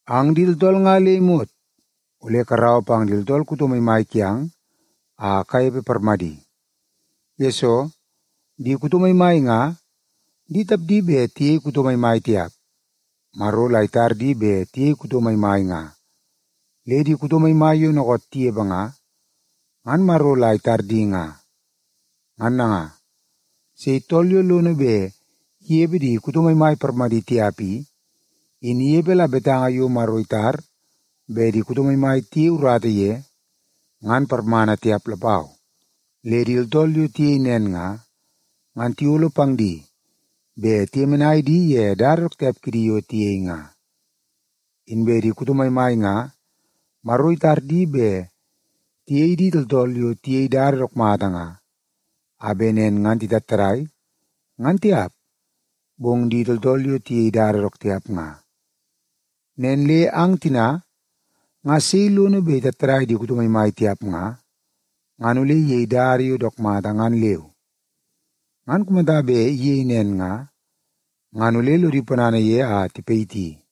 Ang di tooltool nga le imot ole karaua pang di tooltool kuto maimai kiang a kanepe parmadi. Yesoo, di kuto maimai nga di tapdi bet tiyei kuto maimai tiap, Maro la itar di bet tiyei kuto maimai nga. Le di kuto maimai yo dookoot tinepe nga, ngan Maro la itar di nga. Ngan nanga, sei tool yo lono bet inepe di kuto maimai parmadi tiap i, in inepe la betanga yo Maro itar bet di kuto maimai tiyei urata ye ngan parmana tiap lapau. Le di tooltool yo tiyei nen nga, ngan tiyolo pang di bet tiyemenai di ye dada dook tiap kidi yo tiyei nga. Inbe di kuto maimai nga Maro itar di bet tiyei di tooltool yo tiyei dada dook mata nga, a bet nen ngan titattadai, ngan tiap, bong di tooltool yo tiyei dada dook tiap nga. Nen le ang tina nga sei lono bet itattadai di kuto maimai tiap nga, ngan ole iyei dada yo dook mata ngan leu. Ngan kumata bet iyei nen nga, ngan ole lodi ponana ye a tipayiti ye.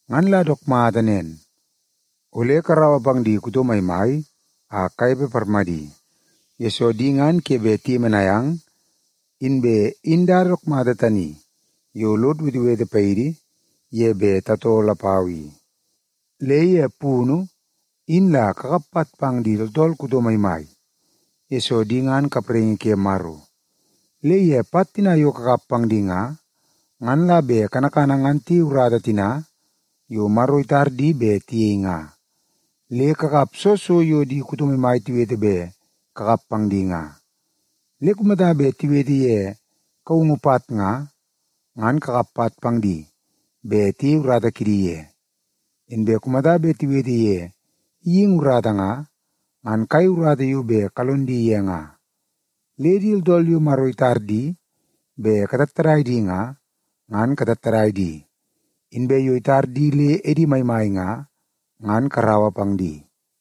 Ngan la dook mata nen, ole karaua pang di kuto maimai a kanepe parmadi, yesoo di ngan ke bet tiyemenai ang, inbe in dada dook mata tani yo lod wetewete paidi ye bet tatoo lapau i. Le ye punu, in la kakap pat pang di tooltool kuto maimai, yesoo di ngan kapraingi ke Maro. Le ye pat tina yo kakap pang di nga, ngan la bet kanakana ngan tiyei urata tina yo Maro itar di bet tiyei nga. Le kakap soo so yo di kuto maimai tiwete bet kakap pang di nga. Le kumata bet tiwete ye kaungu pat nga, ngan kakap pat pang di bet tiyei urata kidi ye. Inbe kumata bet tiwete ye geingi urata nga, ngan kayei urata yo bet kalon di ye nga. Le di tooltool yo Maro itar di bet katattadai di nga, ngan katattadai di. Inbe yo itar di le edi maimai nga, ngan karaua pang di.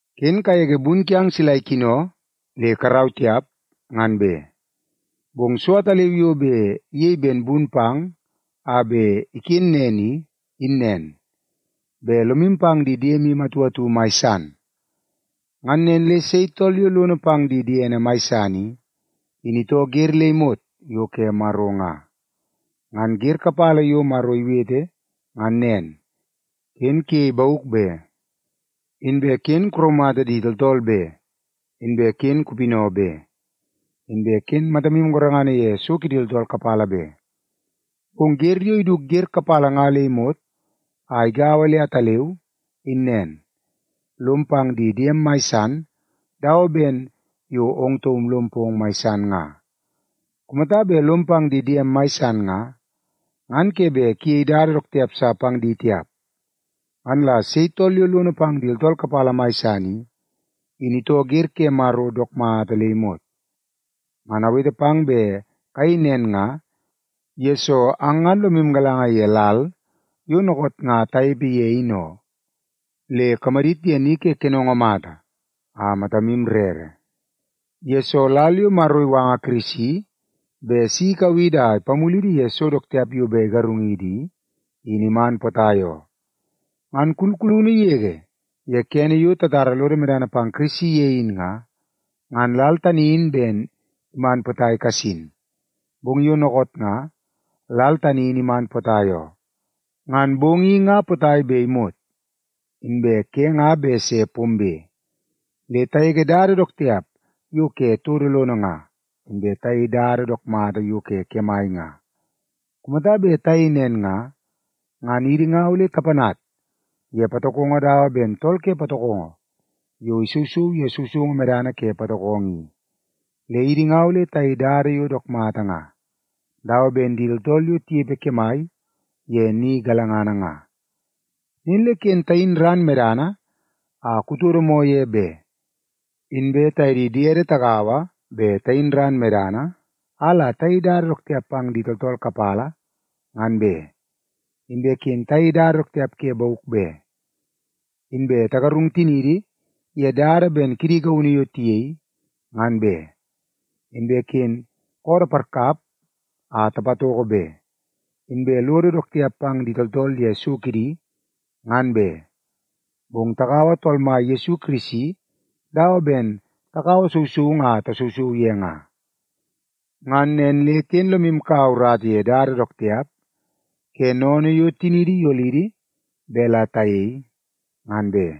Ken kagege bun kiang sila ikino le karau tiap, ngan be. Bong so ataleu yo bet iyei ben bun pang a bet iken nen i, in nen; bet lomu pang di diemu atu atu mai san. Ngan nen le sei tool yo lono pang di diene mai san i, in itoo wer le imot yo ke Maro nga. Ngan wer kapala yo Maro iwete ngan nen, “Ken kuyei bauk be,” inbe “Ken kuraumata di tooltool be,” inbe “Ken kupinau be,” inbe “Ken matamu gorengana ye so kidi tooltool kapala be.” Bong wer yo iduk wer kapala nga le imot a igaua le ataleu, in nen: “Lom pang di diem mai san dawa ben yo ong taum lom pong mai san nga.” Kumata bet lomu pang di diemu mai san nga, ngan ke bet kuyei dada dook tiap sa pang di tiap. Ngan la sei tool yo lono pang di tooltool kapala mai san i, in itoo wer ke Maro dook mata le imot. Ngan awete pang bet kayei nen nga, yesoo ang ngan lomu galanga ye lal yo dookoot nga tanepe ye in oo. Le kamadit ye ni ke kenongo mata a matamu rere, yesoo lal yo Maro iwanga Kirisi bet si ikau idi a ipamulidi ye so dook tiap yo bet igarungidi i, in iman potai oo. Ngan kulkulunu yege ye kene yo tatara lodo medana pang Kirisi ye in nga, ngan lal tani in ben iman potai kasin, bong yo dookoot nga, lal tani in iman potai oo. Ngan bong i nga potai bet imot, inbe ke nga bet se pombe. Le tagege dada dook tiap yo ke todo lono nga, inbe tayei dada dook mata yo ke kemai nga. Kumata bet tayei nen nga, ngan idi nga ole tapanat ye patokongo dawa ben tool ke patokongo yo isousou ye sousoungu medana ke patokongo i. Le idi nga ole tayei dada yo dook mata nga, dawa ben di tooltool yo tinepe kemai ye ni galangana nga. Nen le ken tayin ran medana a kutodo moo ye be, inbe taye di diede tagaua bet tayin ran medana a la tayei dada dook tiap pang di tooltool kapala, ngan be. Inbe ken tayei dada dook tiap ke bauk be, inbe tagarung tiniidi ye dada ben kidi gaunu yo tiyei, ngan be. Inbe ken koodoo parkap a tapatoko be, inbe lodo dook tiap pang di tooltool ye so kidi, ngan be. Bong takaua Tool Mai Yesu Kirisi dawa ben takaua sousoungu a tasousou ye nga. Ngan nen le ken lomu kaua urata ye dada dook tiap ke sennene yo tiniidi iyolidi bet la tayei, ngan be.